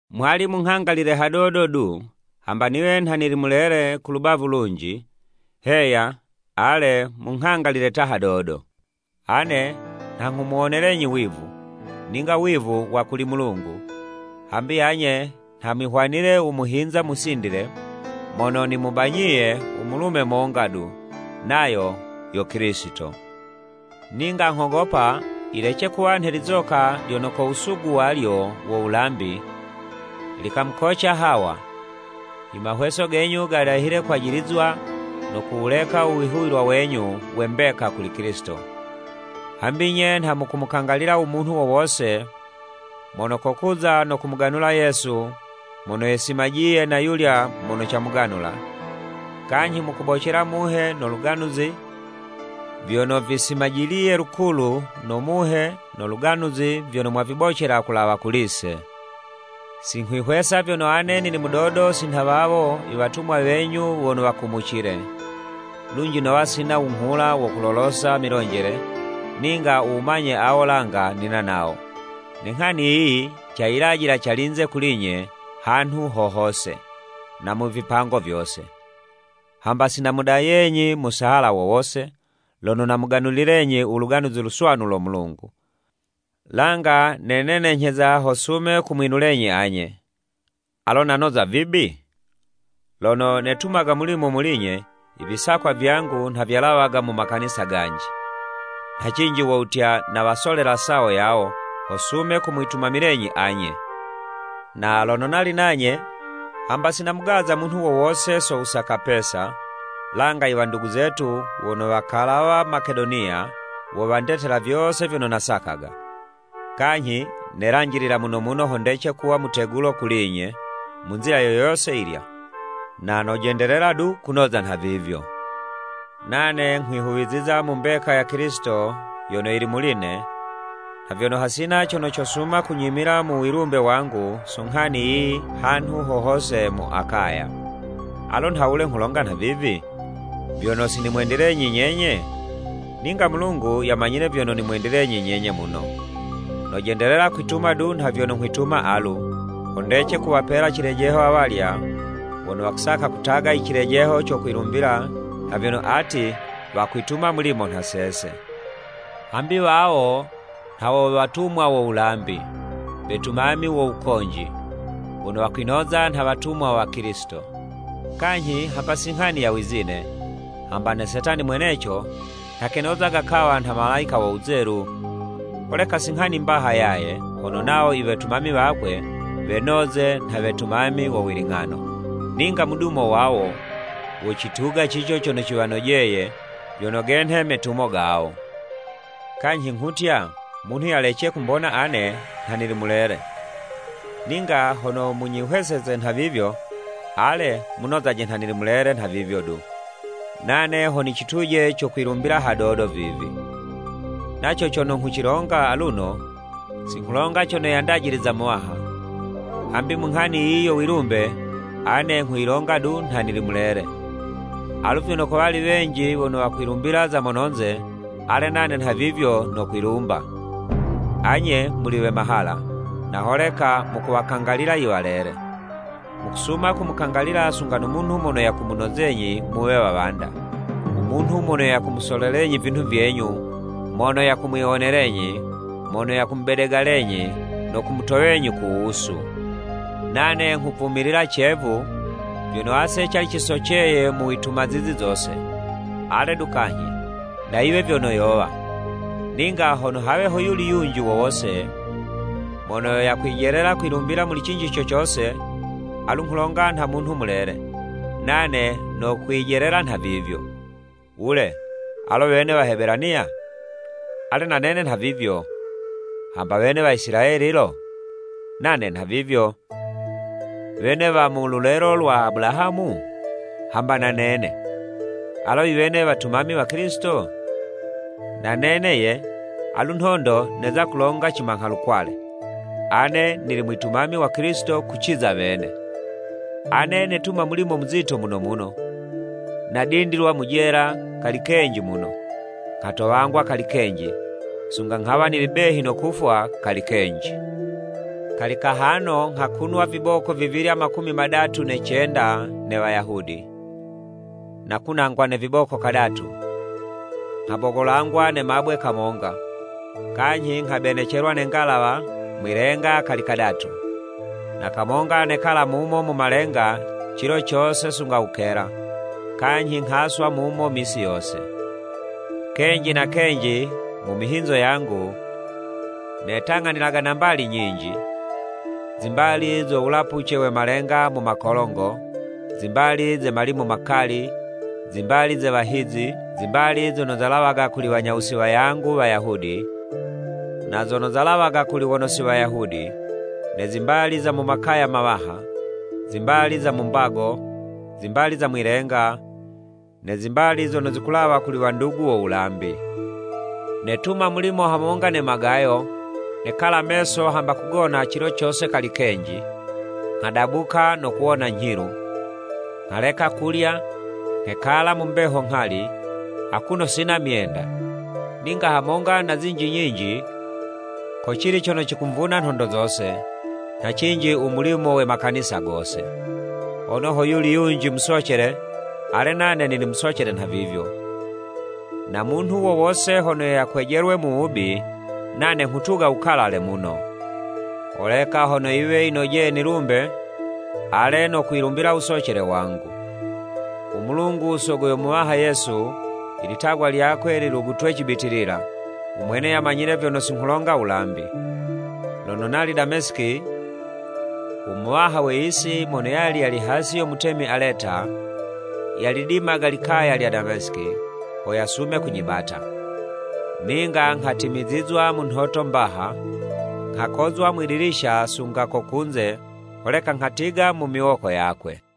Mwali munghangalilile hadodo du, hamba niwe nha nili mulele ku lubavu lunji! Heya, ale munghangalilile ta hadodo. Ane nha nghumuwonelenyi wivu, ninga wivu wa kuli Mulungu, hambi anye nha mwihwanile u muhinza musindile mono nimubanyiye u mulume monga du, nayo yo Kilisito. Ninga nghogopa yilece kuwa nhe lizoka lyono ko wusugu walyo wo wulambi, likamukoca Hawa, i mahweso genyu gadahile kwajilizwa no kuwuleka u wihuwilwa wenyu we mbeka kuli Kilisito. Hambi nye nha mukumukangalila u munhu wo wose mono kokuza no kumuganula Yesu mono yesimajiye na yulya mono camuganula, kanyhi mukubocela muhe no luganuzi vyono visimajiliye lukulu no Muhe no Luganuzi vyono mwavibocela kulawa kuli'se. Si nghwihwesa vyono ane nili mudodo si nha wawo “I Watumwa wenyu wono wakumucile!” Lunji nowa sina wunghula wo wulolosa milonjele, ninga u wumanye awo langa nina nawo, ne nghani yiyi cayilajila calinze kuli'nye hanhu ho hose, na mu vipango vyose. Hamba si namudayenyi musahala wo wose, lono namuganulilenyi u Luganuzi Luswanu lo Mulungu, langa nenenenyheza ho sume kumwinulenyi anye. Alo nanoza vibi? Lono netumaga mulimo muli'nye, i visakwa vyangu nha vyalawaga mu makanisa ganji. Nha cinji wo wutya nawasolela sawo yawo, ho sume kumwitumamilenyi anye. Na lono nali nanye, hamba si namugaza munhu wo wose so wusaka pesa, langa i wandugu zetu wono wakalawa Makedoniya, wo wandetela vyose vyono nasakaga. Kanyhi nelanjilila muno muno ho ndece kuwa mutegulo kuli'nye, mu nzila yo yose yilya, na nojendelela du kunoza nhavivyo. Nane nghwihuwiziza mu mbeka ya Kilisito yono yili muli'ne, nha vyono hasina cono cosuma kunyimila mu wilumbe wangu so nghani yiyi hanhu ho hose mu Akaya. Alo nhawule nghulonga nhavivi? Vyono si nimwendilenyi nyenye? Ninga Mulungu yamanyile vyono nimwendilenyi nyenye muno! Nojendelela kwituma du nha vyono nghwituma alu, ho ndece kuwapela cilejeho awalya wono wakusaka kutuga icilejeho co kwilumbila nha vyono ati wakwituma mulimo nha sese. Hambi wawo nha wo watumwa wo wulambi, wetumami wo wukonji, wono wakwinoza nha watumwa wa Kilisito. Kanyhi hamba si nghani ya wizine, hamba na Setani mweneco nha kenozaga kawa nha malayika wo wuzelu! Holeka si nghani mbaha yaye, hono wawo i wetumami wakwe wenoze nha wetumami wo wiling'ano. Ninga mudumo wawo, wocituga cico cono ciwanojeye vyono genhe metumo gawo. Kanyhi nghutya, Munhu yalece kumbona ane nha nili mulele. Ninga hono munyihweseze nhavivyo, ale munozaje nha nili mulele nhavivyo du, nane ho nicituje co kwilumbila hadodo vivi. Naco cono nghucilonga aluno, si nghulonga cono yandajiliza Muwaha, hambi mu nghani yiyi yo wilumbe, ane nghuyilonga du nha nili mulele. Alu vyono kowali wenji wono wakwilumbila za mononze, ale nane nhavivyo nokwilumba. Anye muli we mahala, na holeka mukuwakangalila i walele! Mukusuma kumukangalilila sunga no munhu mono yakumunozenyi muwe wawanda, u munhu mono kumusolelenyi vinhu vyenyu, mono yakumwiwonelenyi, mono yakumubedegalenyi no kumutowenyi ku wusu! Nane nghuvumilila cevu, vyono ase cali cisoceye mu wituma zizi zose. Ale du kanyhi, na yiwe vyono yowa, ninga hono hawe hoyuli yunji wo wose mono yakwijelela kwilumbila muli cinji co cose, alu nghulonga nha munhu mulele, nane nokwijelela nhavivyo. Wule, alo wene Wahebelaniya? Ale na nene nhavivyo. Hamba wene Waisilayeli lo? Nane nhavivyo. Wene wamu lulelo lwa Abulahamu? Hamba na nene. Alo iwene wetumami wa Kilisito? Na nene ye, alu nhondo, neza kulonga cimangha-lukwale, ane nili mwitumami wa Kilisito kuciza wene. Ane netuma mulimo muzito muno muno, nadindilwa mu jela kali kenji muno, nghatowangwa kali kenji, sunga nghawa nili behi no kufwa kali kenji. Kali kahano nghakunwa viboko vivilya makumi madatu ne cenda ne Wayahudi. Nakunangwa ne viboko kadatu, nghabogolangwa ne mabwe kamonga, kanyhi nghabenecelwa ne nghalawa mwi'lenga kali kadatu, na kamonga nekala mumo mu malenga cilo cose sunga wukela, kanyhi nghaswa muno misi yose. Kenji na kenji mu mihinzo yangu, netang'anilaga na mbali nyinji, zimbali zo wulapuce we malenga mu makolongo, zimbali ze malimu makali, zimbali ze wahizi, zimbali zono zalawaga kuli wanyawusi wayangu Wayahudi, na zono zalawaga kuli waono si Wayahudi, ne zimbali za mu makaya mawaha, zimbali za mu mbago, zimbali za mwi'lenga, ne zimbali zono zikulawa kuli wandugu wo wulambi! Netuma mulimo hamonga ne magayo, nekala meso hamba kugona cilo cose kali kenji, nghadabuka no kuwona nyhilu. Nghaleka kulya, nghekala mu mbeho nghali, akuno sina myenda. Ninga hamonga na zinji nyinji, kocili cono cikumvuna nhondo zose, nha cinji u mulimo we makanisa gose. Hono hoyuli yunji musocele, ale nane nili musocele nhavivyo, na munhu wo wose hono yakwejelwe mu wubi, nane nghutuga wukalale muno. Holeka hono yiwe yinojeye nilumbe, ale, nokwilumbila wusocele wangu. U Mulungu Sogo yo Muwaha Yesu, ilitagwa lyakwe lilugutwe cibitilila! U Mwene yamanyile vyono si nghulonga wulambi. Lono nali Damesiki, u muwaha we yisi, mono yali yali hasi yo mutemi Aleta, yalidimaga likaya lya Damesiki, ho yasume kunyibata. Ninga nghatimizizwa mu nhoto mbaha, nghakozwa mwidilisha sunga ko kunze, holeka nghatiga mu miwoko yakwe.